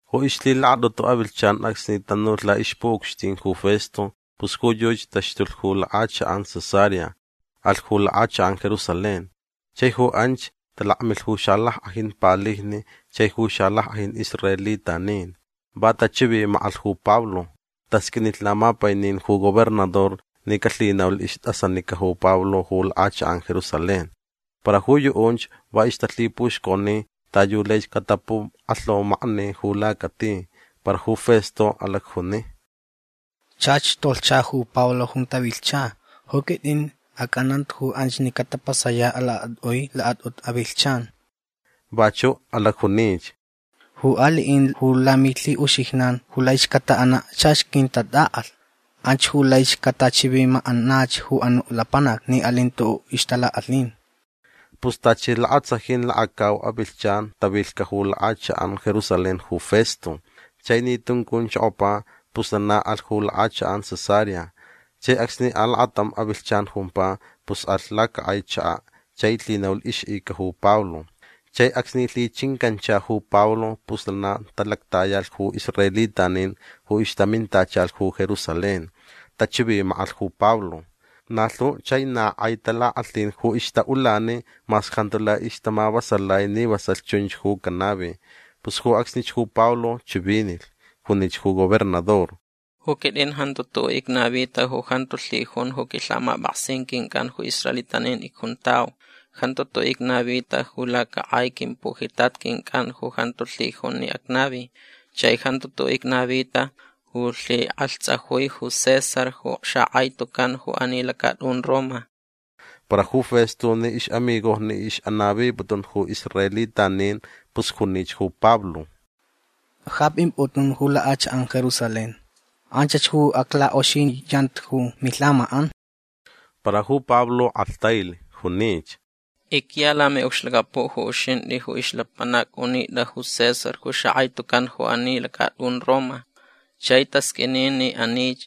Ju ixlhilakatʼutu avilhchan acsni tanulh laʼixpuʼucxtin ju Festo pus ju yuchi taxtulh ju lakʼachakʼan Cesarea. Alh ju lakʼachakʼan Jerusalén. Chai ju anch talakmilh ju xalackʼajin palijni chai ju xalackʼajin israelitanin. Va tachivimakʼalh ju Pablo. Tasqʼuinilh lamapainin ju gobernador ni calhinaulh istʼasanica ju Pablo ju lakʼachakʼan Jerusalén. Para ju yuʼunch va ixtalhipuxconi ta yu laich catapukʼalhaumakni ju lacati. Para ju Festo alacjuni: ―Chach tolhcha ju Pablo junta vilhcha. Ju quitʼin acʼananta ju anch ni catapasayaʼ lakatʼui lakatʼutu avilhchan. Vachuʼ alacjunich: ―Ju aliʼin ju lamilhiʼuxijnan ju laich cataʼanaʼ chach quintatʼaʼalh. Anch ju laich catachivimakʼanach ju anuʼ lapanac ni alin tuʼuʼ ixtalakʼalhin. Pus tachi lakatsajin lakacau avilhchan tavilhcaʼ ju lakʼachakʼan Jerusalén ju Festo. Chai ni tuncunchokopa pus lana alhch ju lakʼachakʼan Cesarea. Chai acsni alakatam avilhchan jumpa pus alh lacakʼai chakaʼ chai lhinaulh ixʼica ju Pablo. Chai acsni lhichincancha ju Pablo pus lana talactayalh ju israelitanin ju ixtamintachalh ju Jerusalén. Tachivimakʼalh ju Pablo. Na lhu chai na kʼai talakʼalhin ju ixtaʼulani mas jantu lai ixtamavasalai ni vasalh chunch ju canavi. Pus ju acsnich ju Pablo chivinilh. Junich ju gobernador: ―Ju quitʼin jantu tuʼuʼ icnavita ju jantu lhijun ju quilhamapʼaksin quincʼan ju israelitanin icjuntau. Jantu tuʼuʼ icnavita ju lacakʼai quimpujitat quincʼan ju jantu lhijun ni acnavi. Chai jantu tuʼuʼ icnavita ju lhikʼalhtsʼajui ju César ju xakʼai tucan ju ani lacatʼun Roma. Para ju Festo ni ixʼamigojni ixʼanaviputun ju israelitanin pus junich ju Pablo: ―Ja pʼimpʼutʼun ju lakʼachakʼan Jerusalén. Anchach ju aclakʼoxiniyanta ju milhamakʼan. Para ju Pablo kʼalhtailh. Junich: ―Icya lamiʼucxlacapuʼ ju uxintʼi ju ixlapanac unitʼa ju César ju xakʼai tucan ju ani lacatʼun Roma. Chai tasqʼuini ni anich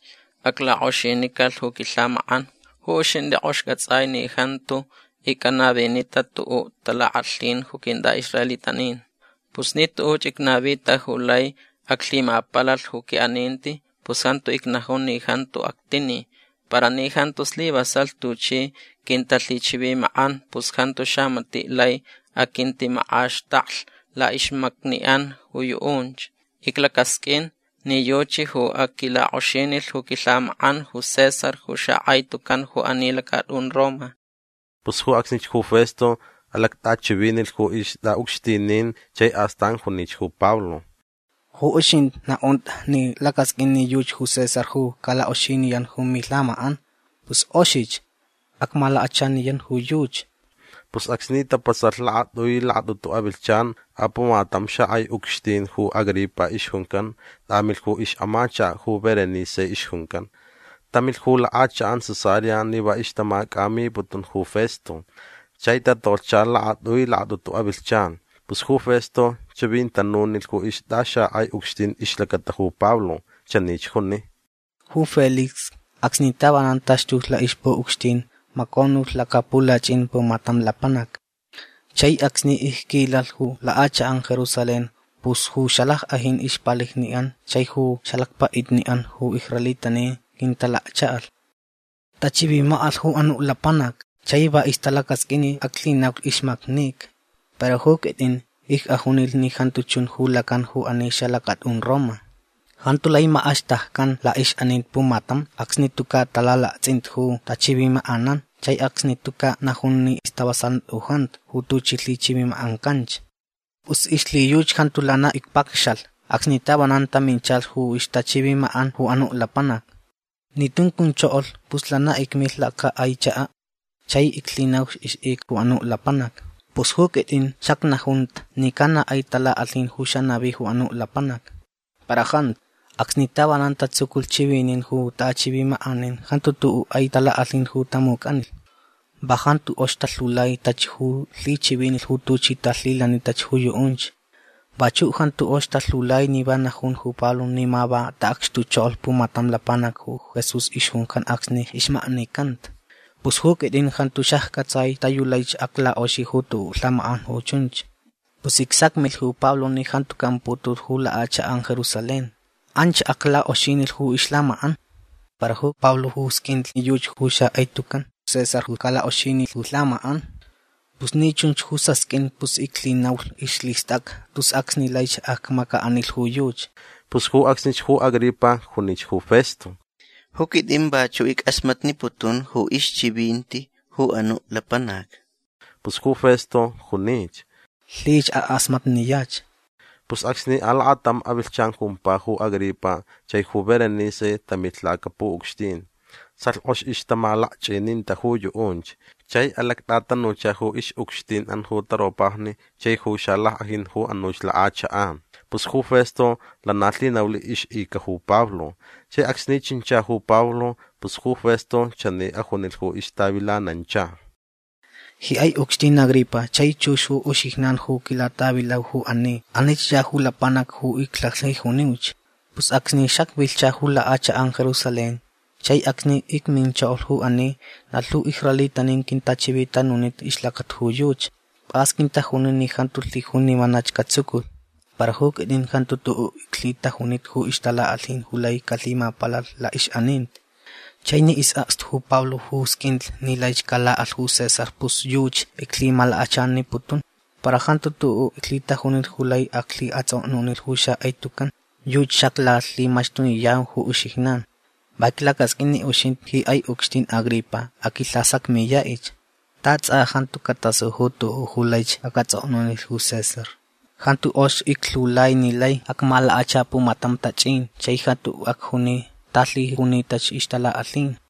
aclakʼoxinicalh ju quilhamakʼan. Ju uxintʼi kʼoxich cʼatsʼai ni jantu icʼanavinita tuʼuʼ talakʼalhin ju quintʼaʼisraelitanin. Pus ni tuʼuch icnavita ju lai aclhimapalalh ju quiʼaninti pus jantu icnajun ni jantu actini. Para ni jantu slivasalh tuchi quintalhichivimakʼan pus jantu xamatiʼ lai aquintimakʼaxtaklh laʼixmacniʼan ju yuʼunch. Iclacasqʼuin ni yuchi ju aquilakʼoxinilh ju quilhamakʼan ju César ju xakʼai tucan ju ani lacatʼun Roma. Pus ju acsnich ju Festo alactʼachivinilh ju ixtʼaʼucxtinin chai astan junich ju Pablo: ―Ju uxintʼi naʼuntʼa ni lacʼasqʼuin ni yuchi ju César ju calakʼoxiniyan ju milhamakʼan. Pus kʼoxich. Acmalakachaniyan ju yuchi. Pus acsni tapasalh lakatʼui lakatʼutu avilhchan apumatam xakʼai ucxtin ju Agripa ixjuncan tʼamilh ju ixʼamachakaʼ ju Berenice ixjuncan. Tamilh ju lakʼachakʼan Cesarea ni va ixtamacʼamiputun ju Festo. Chai tatolhcha lakatʼui lakatʼutu avilhchan. Pus ju Festo chivintanunilh ju ixtʼaxakʼai ucxtin ixlacata ju Pablo. Chanich juni: ―Ju Félix acsni tavanan taxtulh laʼixpuʼucxtin maconulh lacapulachʼin pumatam lapanac. Chai acsni icquilalh ju lakʼachakʼan Jerusalén pus ju xalackʼajin ixpalijniʼan chai ju xalacpaʼitniʼan ju israelitanin quintalakchaʼalh. Tachivimakʼalh ju anuʼ lapanac chai va ixtalacasqʼuin ni aclhinaulh ixmaknica. Para ju quitʼin icʼajunilh ni jantu chun ju lacan ju ani xalacatʼun Roma. Jantu lai makʼaxtakcan laʼixʼaninti pumatam acsni tucaʼ tʼalalaktsʼinta ju taʼachivimakʼanan chai acsni tucaʼ najun ni stavasalanti u jantu ju tuchi lhichivimakʼancanch. Pus ixlhiyuchi jantu lana icpacxalh acsni tavanan taminchalh ju ixtachivimakʼan ju anuʼ lapanac. Ni tuncunchokolh pus lana icmilh lacakʼai chakaʼ chai iclhinaulh ixʼica ju anuʼ lapanac. Pus ju quitʼin xacnajunta ni ca na kʼai talakʼalhin ju xanavi ju anuʼ lapanac. Para jantu. Acsni tavanan tatsuculh chivinin ju taʼachivimakʼanin jantu tuʼuʼ kʼai talakʼalhin ju tamucʼanilh. Va jantu kʼox talhiulai tachi ju lhichivinilh ju tuchi talhilanitach ju yuʼunch. Vachuʼ jantu kʼox talhiulai ni va najun ju Pablo ni ma va taʼacxtuchokolh pumatam lapanac ju Jesús ixjuncan acsni ixmaknicanta. Pus ju quitʼin jantu xaccʼatsai ta yu laich aclakʼoxi ju tuʼuʼ lhamakʼan ju chunch. Pus icsacmilh ju Pablo ni jantu caʼamputulh ju lakʼachakʼan Jerusalén. Anch aclakʼoxinilh ju ixlhamakʼan. Para ju Pablo sqʼuinlh ni yuchi ju xakʼai tucan César ju calakʼoxinilh ju ixlhamakʼan. Pus ni chunch ju sasqʼuin pus iclhinaulh ixlhistʼacʼa tus acsni laich acmacaʼanilh ju yuchi. Pus ju acsnich ju Agripa junich ju Festo: ―Ju quitʼin vachuʼ ickʼasmatniputun ju ixchivinti ju anuʼ lapanac. Pus ju Festo junich: ―Lhich akʼasmatniyach. Pus acsni alakatam avilhchan jumpa ju Agripa chai ju Berenice tamilh lacapuʼucxtin. Salh kʼox ixtamalakchʼininta ju yuʼunch. Chai alactʼatanucha ju ixʼucxtinʼan ju taropajni chai ju xalackʼajin ju anuch lakʼachakʼan. Pus ju Festo lana lhinaulh ixʼica ju Pablo. Chai acsni chincha ju Pablo pus ju Festo chani ajunilh ju ixtavilanancha: ―Ji kʼai ucxtin Agripa chai chux ju uxijnan ju quilatʼavilau ju ani. Anich ya ju lapanac ju iclalhijuniuch. Pus acsni xacvilhcha ju lakʼachakʼan Jerusalén chai acsni icminchokolh ju ani na lhu israelitanin quintachivitanunita ixlacata ju yuchi. Pʼas quintajuni ni jantu lhijun ni vanach catsuculh. Para ju quitʼin jantu tuʼuʼ iclhitajunita ju ixtalakʼalhin ju lai calhimapalalh laʼixʼaninti. Chai ni isʼakstu ju Pablo ju sqʼuinlh ni laich calakʼalh ju César pus yuchi iclhimalakachaniputun. Para jantu tuʼuʼ iclhitajunita ju lai aclhiʼatsʼoknunilh ju xakʼai tucan. Yuchi xaclalhimaxtuniyau ju uxijnan. Va iclacasqʼuin ni uxintʼi ji kʼai ucxtin Agripa aqʼuilhasacmiyaʼich. Ta tsʼa jantu catasu ju tuʼuʼ ju laich acʼatsʼoknunilh ju César. Jantu kʼox iclhiulai ni lai acmalakacha pumatam tachʼin chai jantu acjuni ta lhijunitach ixtalakʼalhin.